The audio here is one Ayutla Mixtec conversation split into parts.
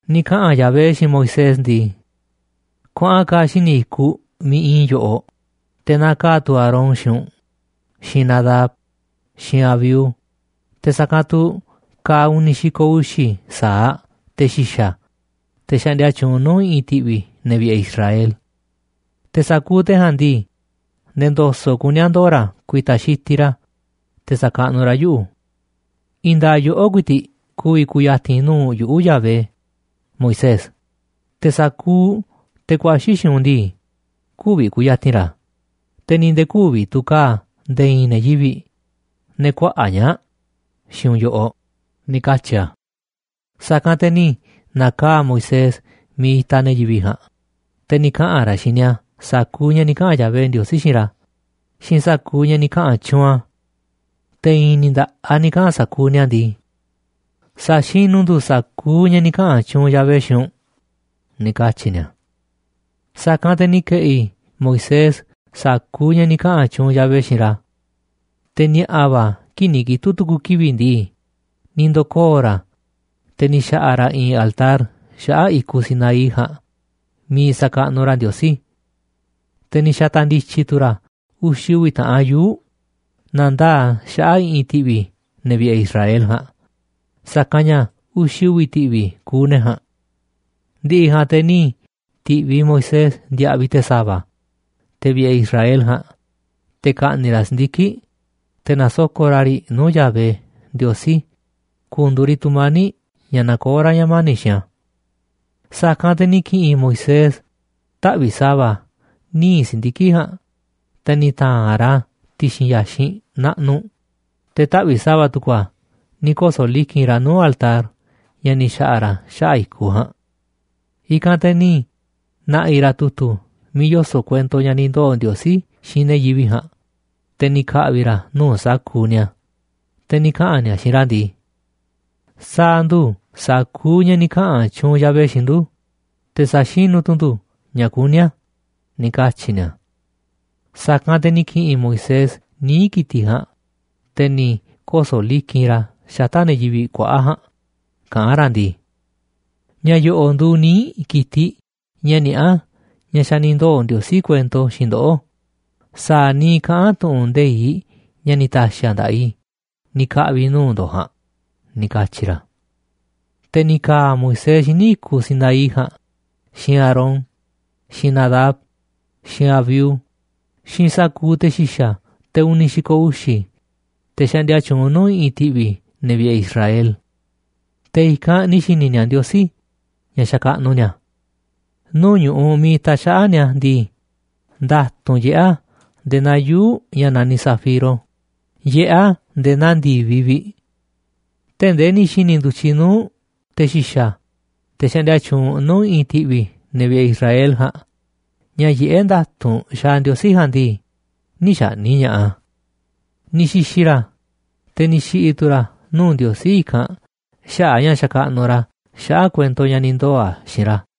Ni̱ kaꞌa̱n ka̱ Yahvé xiinꞌ Moisés ndii: ―Kuaꞌan ka̱a̱ xíniꞌ i̱kuꞌ miiꞌ iinꞌ i̱ yoꞌoꞌ, te̱ naka̱a̱ tu̱ Aarón xiinꞌ u̱nꞌ, xiinꞌ Nadab, xiinꞌ Abiú, te̱ sa̱kanꞌ tu̱ ka̱a̱ uni̱ xi̱ko̱ uxi̱ sa̱aꞌ te̱ xi̱xa̱, te̱ xaꞌndia tyuunꞌ nuu̱ꞌ i̱ꞌi̱n ti̱ꞌvi̱ ne̱ vi̱ꞌe̱ Israel. Te̱ sa̱kuuꞌ te̱ ja̱a̱nꞌ ndii, nde̱e̱ ndo̱so̱ꞌ kuní a̱ ndoo̱ ra̱ ku̱i̱ta̱ xitiꞌ ra̱ te̱ sa̱kaꞌnuꞌ ra̱ yuꞌu̱. I̱i̱n nda̱a̱ꞌ yoꞌó ku̱i̱ti̱ꞌ ku̱vi̱ ku̱ya̱ti̱n nuu̱ꞌ yuꞌu̱, Yahvé, Moisés. Te̱ sa̱kuuꞌ te̱ ku̱a̱xi̱ xiinꞌ u̱nꞌ ndii, kü̱vi̱ ku̱ya̱ti̱n ra̱, te̱ ni̱ nde̱e̱ kü̱vi̱ tu̱ ka̱a̱ nde̱e̱ i̱i̱n ne̱ yivi̱ꞌ, ne̱ kuaꞌa̱ꞌ ñaa̱ꞌ, xiinꞌ u̱nꞌ yoꞌoꞌ ―ni̱ katyi̱ a̱. Sa̱kanꞌ te̱ ni̱ na̱kaa̱ꞌ Moisés miiꞌ itaꞌ ne̱ yivi̱ꞌ ja̱a̱nꞌ, te̱ ni̱ kaꞌa̱n ra̱ xiinꞌ ni̱a̱ sa̱kuuꞌ ña̱ ni̱ kaꞌa̱n Yahvé Ndiosí xiinꞌ ra̱ xiinꞌ sa̱kuuꞌ ña̱ ni̱ kaꞌa̱n tyuunꞌ a̱. Te̱ i̱i̱n ni̱ nda̱ꞌaꞌ ni̱ kaꞌa̱n sa̱kuuꞌ ni̱a̱ ndii: ―Sa̱xinu̱ ndu̱ sa̱kuuꞌ ña̱ ni̱ kaꞌa̱n tyuunꞌ Yahvé xiinꞌ u̱nꞌ ―ni̱ katyi̱ ni̱a̱. Sa̱kanꞌ te̱ ni̱ ke̱ꞌi̱ Moisés sa̱kuuꞌ ña̱ ni̱ kaꞌa̱n tyuunꞌ Yahvé xiinꞌ ra̱. Te̱ ni̱a̱ꞌa̱ va̱ kii̱ꞌ ni̱ kitu̱ꞌ tu̱ku̱ kivi̱ꞌ ndii, ni̱ ndo̱koo̱ ra̱, te̱ ni̱ xa̱ꞌa̱ ra̱ i̱i̱n altar xaꞌa̱ꞌ i̱kuꞌ Sinaí ja̱a̱nꞌ miiꞌ sa̱kaꞌnuꞌ ra̱ Ndiosí. Te̱ ni̱ xa̱ta̱ ndi̱tyi̱ tu̱ ra̱ uxi̱ uvi̱ taꞌan yuu̱ꞌ na̱ndaa̱ꞌ a̱ xaꞌa̱ꞌ i̱ꞌi̱n ti̱ꞌvi̱ ne̱ vi̱ꞌe̱ Israel ja̱a̱nꞌ, sa̱kanꞌ ña̱ uxi̱ uvi̱ ti̱ꞌvi̱ kuuꞌ ne̱ ja̱a̱nꞌ. Ndi̱ꞌi̱ ja̱a̱nꞌ te̱ ni̱ ti̱ꞌviꞌ Moisés ndiaꞌviꞌ te̱ sa̱va̱, te̱ vi̱ꞌe̱ Israel ja̱a̱nꞌ, te̱ ka̱ꞌni̱ꞌ ra̱ si̱ndiki̱ꞌ, te̱ na̱soko̱ꞌ ra̱ riꞌ nuu̱ꞌ Yahvé Ndiosí ku̱ndu̱u̱ riꞌ tu̱mani̱ꞌ ña̱ nakoó ra̱ ña̱ mani̱ꞌ xiinꞌ a̱. Sa̱kanꞌ te̱ ni̱ ki̱ꞌi̱n Moisés taꞌvi̱ꞌ sa̱va̱ níiꞌ si̱ndiki̱ꞌ ja̱a̱nꞌ, te̱ ni̱ ta̱a̱nꞌ ra̱ a̱ ti̱xi̱n ya̱xinꞌ naꞌnuꞌ, te̱ taꞌvi̱ꞌ sa̱va̱ tu̱ku̱ a̱ ni̱ koso̱ liki̱nꞌ ra̱ nuu̱ꞌ altar ña̱ ni̱ xa̱ꞌa̱ ra̱ xaꞌa̱ꞌ i̱kuꞌ ja̱a̱nꞌ. I̱kanꞌ te̱ ni̱ na̱ꞌi̱ ra̱ tu̱tu̱ miiꞌ yoso̱ꞌ kuento ña̱ ni̱ ndoo̱ Ndiosí xiinꞌ ne̱ yivi̱ꞌ ja̱a̱nꞌ, te̱ ni̱ ka̱ꞌvi̱ ra̱ a̱ nuu̱ꞌ sa̱kuuꞌ ni̱a̱, te̱ ni̱ kaꞌa̱n ni̱a̱ xiinꞌ ra̱ ndii: ―Sa̱a̱ ndu̱ sa̱kuuꞌ ña̱ ni̱ kaꞌa̱n tyuunꞌ Yahvé xiinꞌ ndu̱, te̱ sa̱xinu̱ tu̱ ndu̱ ña̱ kuní a̱ ―ni̱ katyi̱ ni̱a̱. Sa̱kanꞌ te̱ ni̱ ki̱ꞌi̱n Moisés níiꞌ ki̱tiꞌ ja̱a̱nꞌ, te̱ ni̱ koso̱ liki̱nꞌ ra̱ a̱ xata̱ꞌ ne̱ yivi̱ꞌ kuaꞌa̱ꞌ ja̱a̱nꞌ kaꞌán ra̱ ndii: ―Ña̱ yo̱ꞌo̱ꞌ nduuꞌ níiꞌ ki̱tiꞌ ña̱ niaꞌá ña̱ xa̱ ni̱ ndoo̱ Ndiosí kuento xiinꞌ ndoꞌó sa̱a̱ niiꞌ kaꞌán tu̱ꞌu̱n nde̱iꞌ ña̱ ni̱ ta̱xi̱ a̱ nda̱ꞌaꞌ i̱ ni̱ ka̱ꞌvi̱ i̱ nuu̱ꞌ ndo̱ꞌ ja̱a̱nꞌ ―ni̱ katyi̱ ra̱. Te̱ ni̱ ka̱a̱ Moisés xíniꞌ i̱kuꞌ Sinaí ja̱a̱nꞌ xiinꞌ Aarón, xiinꞌ Nadab, xiinꞌ Abiú, xiinꞌ sa̱kuuꞌ te̱ xi̱xa̱, te̱ uni̱ xi̱ko̱ uxi̱, te̱ xaꞌndia tyuunꞌ nuu̱ꞌ i̱ꞌi̱n ti̱ꞌvi̱ ne̱ vi̱ꞌe̱ Israel. Te̱ i̱kanꞌ ni̱ xi̱ni̱ ni̱a̱ Ndiosí ña̱ xakaꞌnuꞌ ni̱a̱. Nuu̱ꞌ ñu̱ꞌuꞌ miiꞌ itaꞌ xaꞌa̱ꞌ ni̱a̱ ndii, nda̱tu̱nꞌ yiꞌé a̱ nde̱e̱ naa yuu̱ꞌ ña̱ naniꞌ zafiro, yiꞌé a̱ nde̱e̱ naa ndi̱viꞌ vi̱ꞌ. Tee̱ꞌ ndee ni̱ xi̱ni̱ ndu̱tyiꞌ nuu̱ꞌ te̱ xi̱xa̱, te̱ xaꞌndia tyuunꞌ nuu̱ꞌ i̱ꞌi̱n ti̱ꞌvi̱ ne̱ vi̱ꞌe̱ Israel ja̱a̱nꞌ, ña̱ yiꞌé nda̱tu̱nꞌ xaaꞌ Ndiosí ja̱a̱nꞌ ndii, nï̱ xa̱ꞌni̱ꞌ ña̱ꞌaꞌ a̱. Ni̱ xi̱xi̱ ra̱, te̱ ni̱ xi̱ꞌi̱ tu̱ ra̱ nuu̱ꞌ Ndiosí i̱kanꞌ xaꞌa̱ꞌ a̱ ña̱ xakaꞌnuꞌ ra̱ xaꞌa̱ꞌ kuento ña̱ ni̱ ndoo̱ꞌ a̱ xiinꞌ ra̱.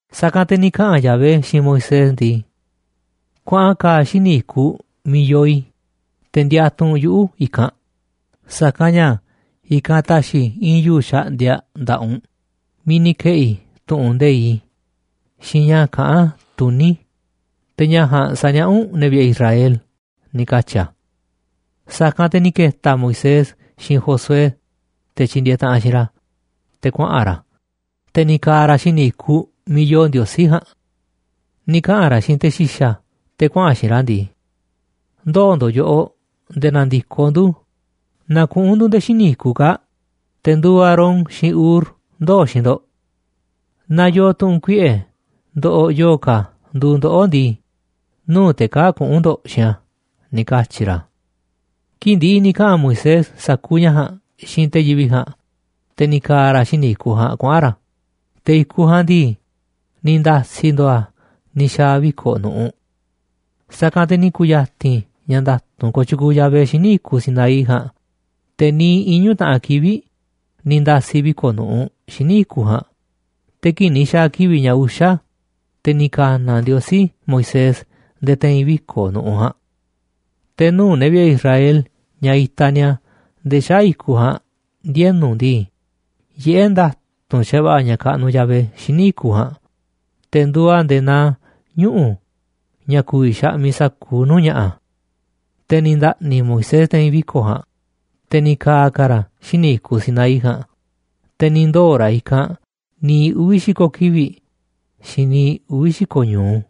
Sa̱kanꞌ te̱ ni̱ kaꞌa̱n Yahvé xiinꞌ Moisés ndii: ―Kuaꞌan ka̱a̱ xíniꞌ i̱kuꞌ miiꞌ yoo i̱, te̱ ndiatuꞌ u̱nꞌ yuꞌu̱ i̱kanꞌ, sa̱kanꞌ ña̱ i̱kanꞌ ta̱xi̱ i̱ i̱i̱n yuu̱ꞌ xaꞌndiaꞌ nda̱ꞌaꞌ u̱nꞌ miiꞌ ni̱ ke̱ꞌi̱ i̱ tu̱ꞌu̱n nde̱iꞌ i̱ xiinꞌ ña̱ kaꞌán tuní i̱, te̱ ña̱ ja̱a̱nꞌ sa̱niaꞌá u̱nꞌ ne̱ vi̱ꞌe̱ Israel ―ni̱ katyi̱ a̱. Sa̱kanꞌ te̱ ni̱ ke̱ta̱ Moisés xiinꞌ Josué, te̱ tyindieeꞌ taꞌanꞌ xiinꞌ ra̱, te̱ kuaꞌa̱n ra̱, te̱ ni̱ ka̱a̱ ra̱ xíniꞌ i̱kuꞌ miiꞌ yoo Ndiosí ja̱a̱nꞌ. Ni̱ kaꞌa̱n ra̱ xiinꞌ te̱ xi̱xa̱ te̱ kuaꞌa̱n xiinꞌ ra̱ ndii: ―Ndoo̱ ndo̱ꞌ yoꞌoꞌ nde̱e̱ na̱ndi̱koꞌ ndu̱. Na kuꞌu̱n ndu̱ nde̱e̱ xíniꞌ i̱kuꞌ kaa̱ꞌ. Te̱ nduuꞌ Aarón xiinꞌ Hur ndoo̱ xiinꞌ ndo̱ꞌ. Naaꞌ yoo tu̱ꞌu̱n kuiꞌe̱ ndoꞌoꞌ yo̱o̱ ka̱ nduuꞌ ndoꞌó ndii, nuu̱ꞌ te̱ kaa̱ꞌ kuꞌu̱n ndo̱ꞌ xiinꞌ a̱ ―ni̱ katyi̱ ra̱. Kii̱ꞌ ndi̱ꞌi̱ ni̱ kaꞌa̱n Moisés sa̱kuuꞌ ña̱ ja̱a̱nꞌ xiinꞌ te̱ yivi̱ꞌ ja̱a̱nꞌ, te̱ ni̱ ka̱a̱ ra̱ xíniꞌ i̱kuꞌ ja̱a̱nꞌ kuaꞌa̱n ra̱. Te̱ i̱kuꞌ ja̱a̱nꞌ ndii, ni̱ nda̱si̱ ndo̱o̱ a̱ ni̱ xa̱a̱ viko̱ꞌ nu̱ꞌuꞌ. Sa̱kanꞌ te̱ ni̱ ku̱ya̱ti̱n ña̱ nda̱tu̱nꞌ kooꞌ tyukuuꞌ Yahvé xíniꞌ i̱kuꞌ Sinaí ja̱a̱nꞌ. Te̱ niiꞌ iñu̱ taꞌan kivi̱ꞌ ni̱ nda̱si̱ viko̱ꞌ nu̱ꞌuꞌ xíniꞌ i̱kuꞌ ja̱a̱nꞌ. Te̱ kii̱ꞌ ni̱ xa̱a̱ kivi̱ꞌ ña̱ uxa̱, te̱ ni̱ ka̱na̱ Ndiosí Moisés nde̱e̱ te̱i̱n viko̱ꞌ nu̱ꞌuꞌ ja̱a̱nꞌ. Te̱ nuu̱ꞌ ne̱ vi̱ꞌe̱ Israel ña̱ itaꞌ ni̱a̱ nde̱e̱ xaꞌa̱ꞌ i̱kuꞌ ja̱a̱nꞌ ndienu̱ ndii, yiꞌé nda̱tu̱nꞌ xa̱va̱ꞌa̱ ña̱ kaꞌnuꞌ Yahvé xíniꞌ i̱kuꞌ ja̱a̱nꞌ. Te̱ nduuꞌ a̱ nde̱e̱ naa ñuꞌu̱ ña̱ ku̱vi̱ xaꞌmiꞌ sa̱kuuꞌ nuu̱ꞌ ña̱ꞌa̱. Te̱ ni̱ nda̱ꞌni̱ Moisés te̱i̱n viko̱ꞌ ja̱a̱nꞌ, te̱ ni̱ ka̱a̱ ka̱ ra̱ xíniꞌ i̱kuꞌ Sinaí ja̱a̱nꞌ. Te̱ ni̱ ndoo̱ ra̱ i̱kanꞌ niiꞌ uvi̱ xi̱ko̱ kivi̱ꞌ xiinꞌ niiꞌ uvi̱ xi̱ko̱ ñu̱u.